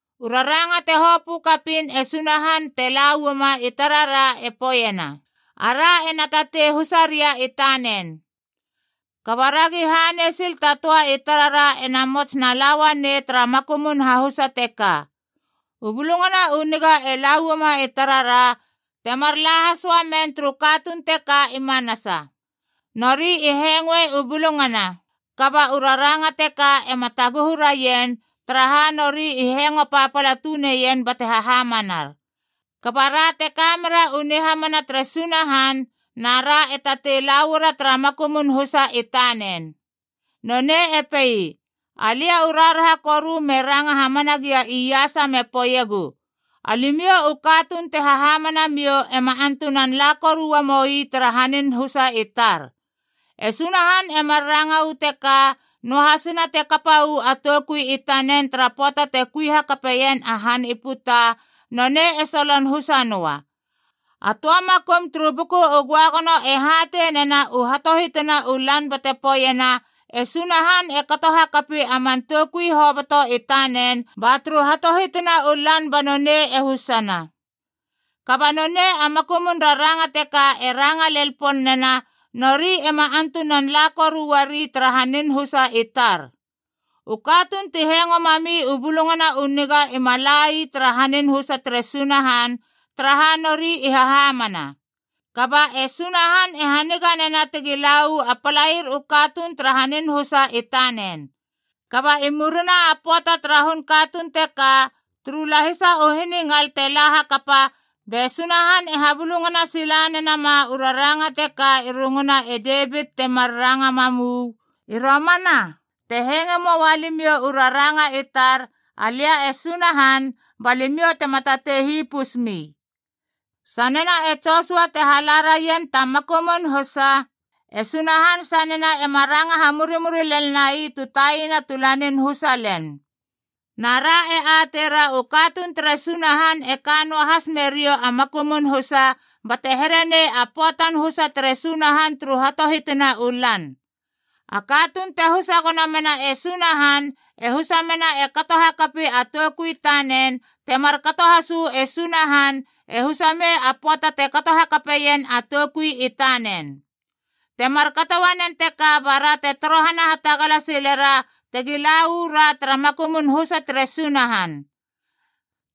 U raranga te hopö kapiin e Sunahan te la uama i tarara e poeiena, ara ena tatei husaria i tanen. Kaba ragi hanei sil ta töa i tarara ena mots na la uanei nonei tara makumun hahusa teka. U Bulungana u Niga e la uama i tarara, temar la has uamen turu katuun teka i manasa. Nori i hengoe u bulungana, kaba u raranga teka ema taguhu raien, taraha nori i hengo papala tuneien bate hahamanar. Kaba ra te kamera u nihamana tere Sunahan na ra e tatei la uara tara makumun husa i tanen. Nonei e pei, “Alia u raharaha koru me ranga hamana gia iasa me poeiegu, ‘Alimiou u katuun te hahamana miou ema antunan la koru uamoi tara hanin husa i tar!’” E Sunahan e mar ranga uu teka, noahasina te kapa uu a toukui i tanen tara pöata te kui hakape ien a han i puta, nonei e solon husa noa. A töa makum turu Buku u Göagono e hatei nena u hatohitina u lan bate poeiena, “E Sunahan e kato hakapi a man toukui hoboto i tanen ba turu hatohitina u lan banonei e husana.” Kaba nonei a makumun raranga teka e ranga lel pon nena, “Nori ema antunan la koru uari tara hanin husa i tar.” U katuun ti hengo mami u Bulungana u Niga ima la ii tara hanin husa tere Sunahan, taraha nori i hahamana. Kaba e Sunahan e haniga nena tegi la uu a palair u katuun tara hanin husa i tanen. Kaba i murina a pöata tara hun katuun teka, turu lahisa u hiningal te la hakapa, be Sunahan e habulungana sila nenama u raranga teka i runguna e Devit timar ranga mam uu, “I romana, te hengoe moa limiou u raranga i tar, alia e Sunahan, ba limiou tema tatei hipus mi.” Sanena e Josua te hala raien ta makumun husa, e Sunahan sanena ema ranga hamurimuri lel nai tu taina tu lanin husa len. Na ra e ateira u katuun tere Sunahan e kanoa has meriou a makumun husa, bate here nei a pöatan husa tere Sunahan turu hatohitina u lan. A katuun te husa gono mena e Sunahan e husa mena e kato hakapi a toukui i tanen, te markato has uu e Sunahan e husa mei a pöata te kato hakapeien a toukui i tanen. Te markato uanen teka bara te torohana hatagala silera tegi la uu ra tara makumun husa tere Sunahan.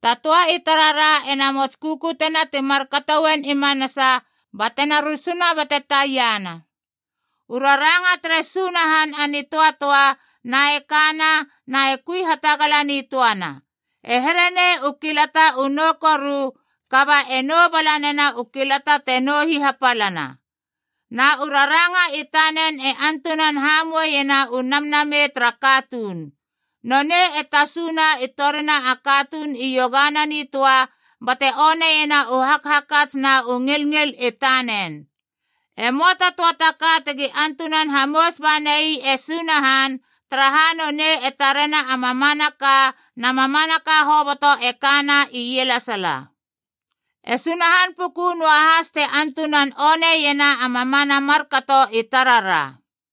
Ta töa i tarara ena mots kukutena ti markato uen i manasa batena rusuna bate taiana. U raranga tere Sunahan a nitöatöa, na e kana na e kui hatagala nitöana. E here nei u kilata u nou koru, kaba e nou bala nena u kilata te nou hihapalana. Na u raranga i tanen e antunan hamoueiena u namnamei tara katuun. Nonei e tasuna i torina a katuun iogana nitöa, bate oneiena u hakhakats na u ngilngil i tanen. E möa ta töa ta ka tegi antunan hamous banai e Sunahan, taraha nonei e tarena a mamanaka na mamanaka hoboto e kana ielesala. E Sunahan puku noahas te antunan oneiena a mamana markato i tarara.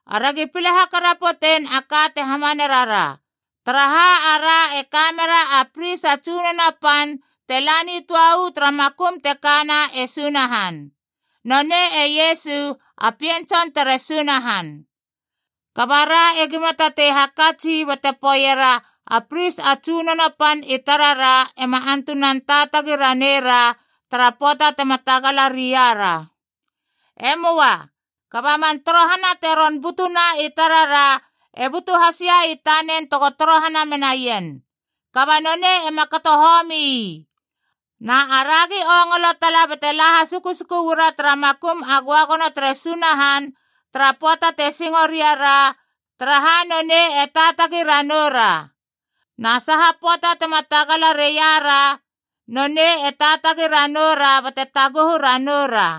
Aragi pile hakarapotein a ka te hamane rara. Taraha, ara e ka mera a pris a tsunono pan te la nitöa uu tara makum te kana e Sunahan. Nonei e Iesu, a Pien Tson tere Sunahan. Kaba ra egima tatei hakats ii bate poeiera a pris a tsunono pan i tarara ema antunan taatagi ranei ra tara pöata tema tagala ria ra. E möa. Kaba man torohana te ron butuna i tarara, e butu hasia i tanen tego torohana menaien. Kaba nonei ema kato homi ii. Na aragi ongolo tala bate la hasukusuku uara tara makum a göagono tere Sunahan tara pöata te singo ria ra, taraha nonei e taatagi ranoura ra. Na saha pöata tema tagala reia ra, nonei e taatagi ranou ra bate taguhu ranou ra.